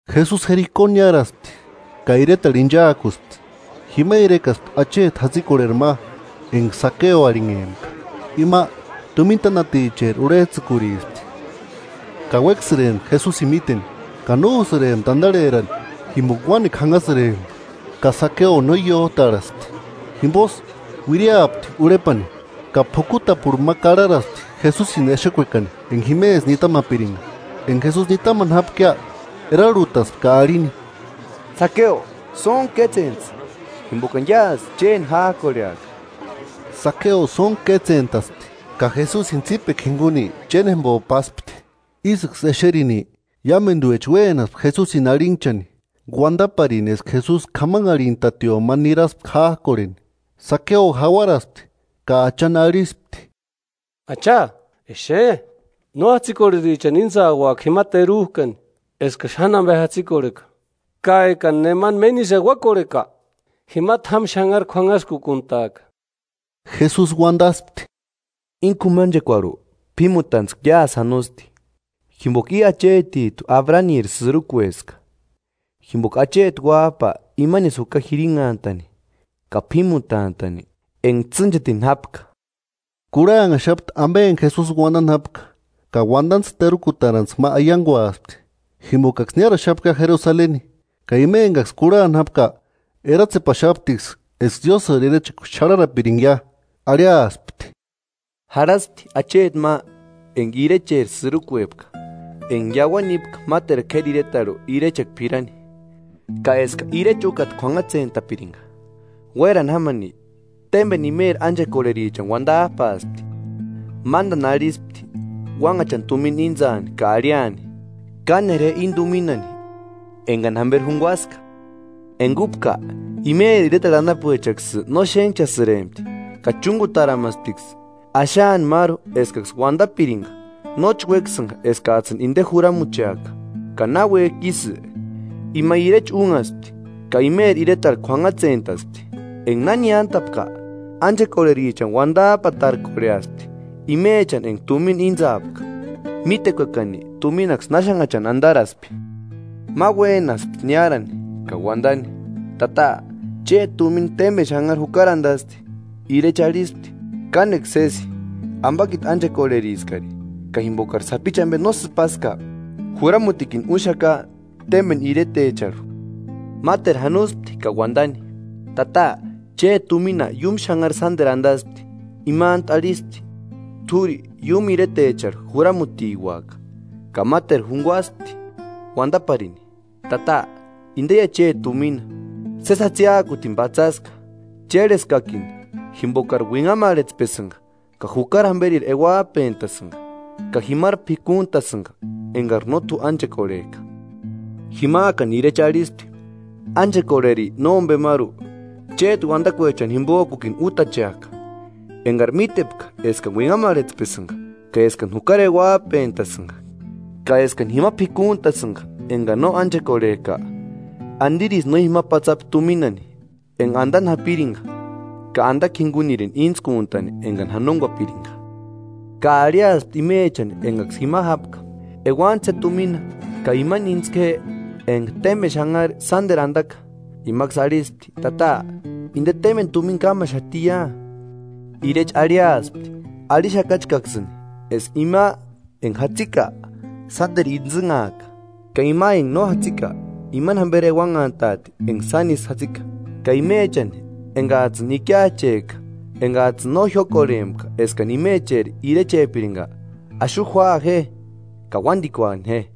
Jesusi Jeriko niáraspti ka iretarhu inchaakuspti. Jima irekaspti acheti jatsikorheri ma enga Sakeo arhinhempka, ima tumina tánaticheri urhejtsïkurispti. Ka uéksïrempti Jesusini míteni, ka no úsïrempti andarherani jimboka uánekua jánhasïrempka ka Sakeo no iójtarhaspti Jimbosï uiriapti urhepani, ka p'ukutapurhu ma karharaspti Jesusini exekuekani, enga jimesï nitamapiringa. Enga Jesusi nitamani jápkia, erarhutaspti ka arhini: –Sakeo, sóntku kétsentsï, jimbokani iásï chéni jájkorheaka. Sakeo sóntku kétsentaspti ka Jesusini tsípekua jinguni chénjembo paspti. Ísïksï exerini, iámenduecha uénaspti Jesusini arhinhchani, uandaparini eska Jesusi k'amanharhintatio ma niraspka jájkorheni. Sakeo jauaraspti ka Achani arhispti: –Acha exe, no jatsikorherichani íntsauaka jima terujkani eskani xáni ambe jatsikorheka; ka ekani nemani méni isï euakorheka, jima t'ámu xanhari k'uanhaskukuntaaka. Jesusi uandaspti: –Íni k'umanchekuarhu p'ímutantskua iásï janosti, jimboka i achetijtu Abraniri sïrukueska. Jimboka acheti Uájpa imanisï juka jirinhantani ka p'ímutantani enga tsînchetini jápka. Kurhanhaxapti ambe enga Jesusi uandani jápka, ka uandantskua terukutarantskua ma aianguaspti, jimbokaksï niáraxapkia Jerusaleni ka ima engaksï kurhani jápka eratsepaxaptiksï eska Diósïri irechekua xarharapiringia. Arhiaspti: “Jarhaspti acheti ma enga irechecheri sïrukuepka, enga iauani nípka máteru k'éri iretarhu irechekua p'irani, ka eska irecha úkata k'uanhatsentapiringa. Uérani jámani, témbeni imeri ánchekorherichani uandajpaaspti, mándani arhispti uánhachani tumina íntsaani ka arhiani: ‘Kánera je íni tuminani engani jamberi junguaska’ Enga úpka, imeri iretarhu anapuechaksï no xénhchasïrempti, ka chúngutaramasptiksï axaani máru eskaksï uandapiringa: ‘Nóchi uéksïnga eskajtsïni inde juramucheaka.’” “Ka náuejki ísï, ima irecha únhaspti, ka imeri iretarhu k'uanhatsentaspti. Enga na niántapka, ánchekorherichani uandajpatarkorheaspti, imechani enga tumina íntsaapka, mítekuekani tuminaksï náxannhachani andaraspi. Ma uénaspti niárani ka uandani: ‘Tata, chéti tumina témbeni xanhari jukari andasti.’ Irecha arhispti: ‘Kánekua sési, ambakiti ánchekorheriskari; ka jimbokari sapichu ambe no sïpaska, juramutikini úxaka témbeni iretecharhu.’ Máteru janospti ka uandani: ‘Tata, chéti tumina iúmu xanhari sánderu andasti.’ Imantu arhispti: ‘T'úri iúmu iretecheri juramutiuaka.’” “Ka máteru junguaspti uandaparini: ‘Tata, indeia chéti tumina. Sési jatsiakutini patsaska; chérheskakini, jimbokari uinhamarhetspesïnga, ka jukari jamberiri euajpentasïga, ka jimari p'ikuntasïnga engari no t'u ánchekorhejka.’ Jimajkani irecha arhispti: ‘Ánchekorheri nómbemaru, chéti uandakuechani jimbojkukini útacheaka. Engari mítepka eskani uinhamarhetspesïnga, ka eskani jukari euajpentasïnga ka eskani jima p'ikuntasïnga engani no ánchekorhejka, ¿Andirisï no jima patsapi tuminani enga andani japiringa, ka andakua jingunirini íntskuntani engani janonguapiringa?’ Ka arhiaspti imechani engaksï jima jápka: ‘Euantsï je tumina ka imani íntsku je enga témbeni xanhari sánderu andaka.’ Imaksï arhispti: ‘Tata, ¡Inde témbeni tumina kámaxatia!’ Irecha arhiaspti: ‘Arhixakachkaksïni, eska ima enga jatsika, sánderu intsïnhaaka; ka ima enga no jatsika, imani jamberi euanhantaati enga sánisï jatsika. Ka imechani engajtsïni ikiachejka, engajtsïni no jiókorhempka eskani imecheri irechepiringa, axu júaa je ka uándikuani je.’”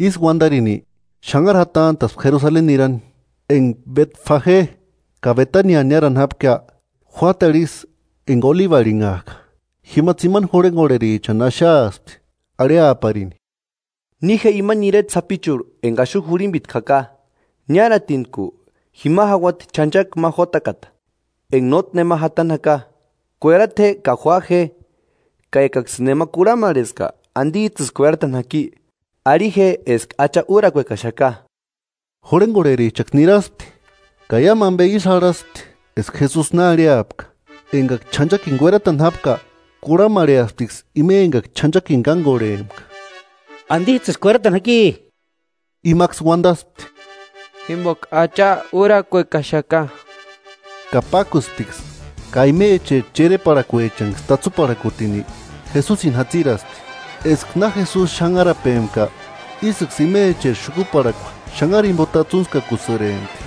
Ísï uandarini, xanhari jatantaspti Jerusaleni nirani. Enga Betfage ka Betania niárani jápkia, juátarhu ísï enga Olibu arhinhajka, tsimani jurhengorherichani axaaspti, arhiaparini: –Ni je imani ireta sapichurhu enga ixu jurhimbitku jaka, niáratinku, jima jauati ch'anchaki ma jótakata, enga nótki nema jatani jaka, kuerata je ka jua je. Ka ekaksïni nema kurhamarheska ¿Andijtsïsï kueratani jaki? Arhi je eska Acha úrakuekaxaka. Jurhengorherichaksï niraspti ka iámu ambe ísï jarhaspti eska Jesusi na arhiapka Engaksï ch'anchakini kueratani jápka, kurhamarheasptiksï ima engaksï ch'anchakini kángorhempka: –¿Andijtsïsï kueratani jaki? Imaksï uandaspti: –Jimboka Acha úrakuekaxaka. Ka pákusptiksï, ka imecheri chereparhakuechanksï tatsuparhakutini Jesusini jatsiraspti. Eska na Jesusi xanharapempka, ísïksï imecheri xukuparhakua xanhari jimbo tatsuntskakupasïrempti.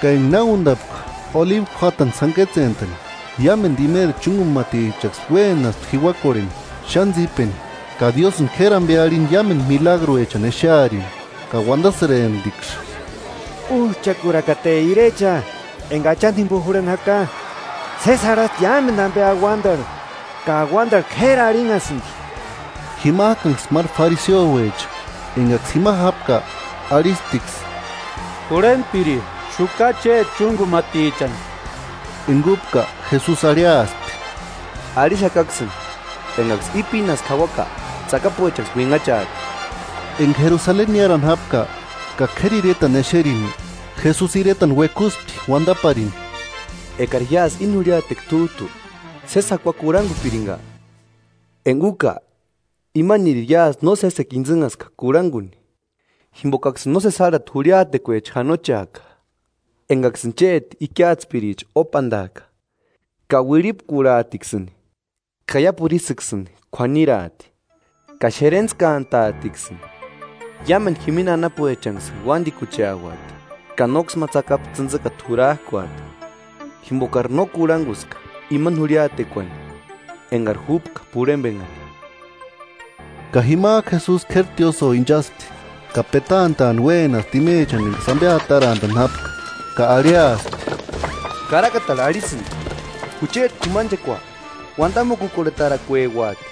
Ka enga na úndapka Olibu juátani sáni kétsentani, iámendu imeri chúngumatichaksï uénaspti jiuakorheni xáni tsípeni ka Diósïnksï k'éri ambe arhini iámendu milagruechani exearini. Ka uandasïremptiksï: –¡Újchakurakate irecha enga Achani jimbo jurhani jaka! ¡Sési jarhasti iámendu ambe auandarhu ka auandarhu k'éri arhinhasïndi! Jimajkanksï máru fariseouecha engaksï jima jápka arhisptiksï: –Jurhentpiri, xukaa chéti chúngumatichani. Enga úpka Jesusi arhiaspti: –Arhixakaksïni, engaksï i pínasku jauaka tsakapuechaksï uinhachaati. Enga Jerusaleni niárani jápka, ka k'éri iretani exeni, Jesusi iretani uekuspti uandaparini: “¡Ekari iásï íni jurhiatekua t'újtu sési jakuani kurhangupiringa! Enga úka imaniri iásï no sésekua intsïnhaska kurhanguni. Jimbokaksïni nósesi járhati jurhiatekuecha janocheaka, engaksïni chéti ikiatspiricha ópandaaka, ka uirhipkurhaatiksïni ka iápuru ísïksïni k'uaniraati, ka xerentskantaatiksïni. Iámendu jimini anapuechanksïni uándikucheati, ka nóksï ma tsakapu tsïntsikata jurajkuati, jimbokari no kurhanguska imani jurhiatekuani engari juka p'urhembenhani.” Ka jimajku Jesusi k'éri tiósïo inchaspti, ka petantaani uénaspti imechani engaksï ambe atarantani jápka, ka arhiaspti: –“Karakatarhu arhisïndi: ‘Jucheti k'umanchekua uandamukukorhetarakueuati’,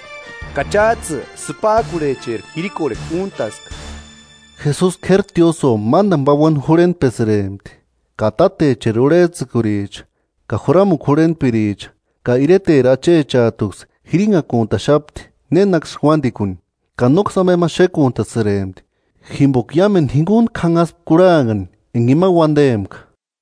ka chájtsï sïpajkurhecheri jirikorhekua úntaska.” Jesusi k'éri tiósïo mándani pauani jurhentpesïrempti, ka tátecheri urhejtsïkuricha ka juramukua jurhentpiricha ka ireteri achechajtuksï jirinhakuntaxapti nénaksï uándikuni. Ka nóksï ambe ma xékuntasïrempti jimboka iámendu jinguntku janhaspka kurhanhani enga ima uandempka.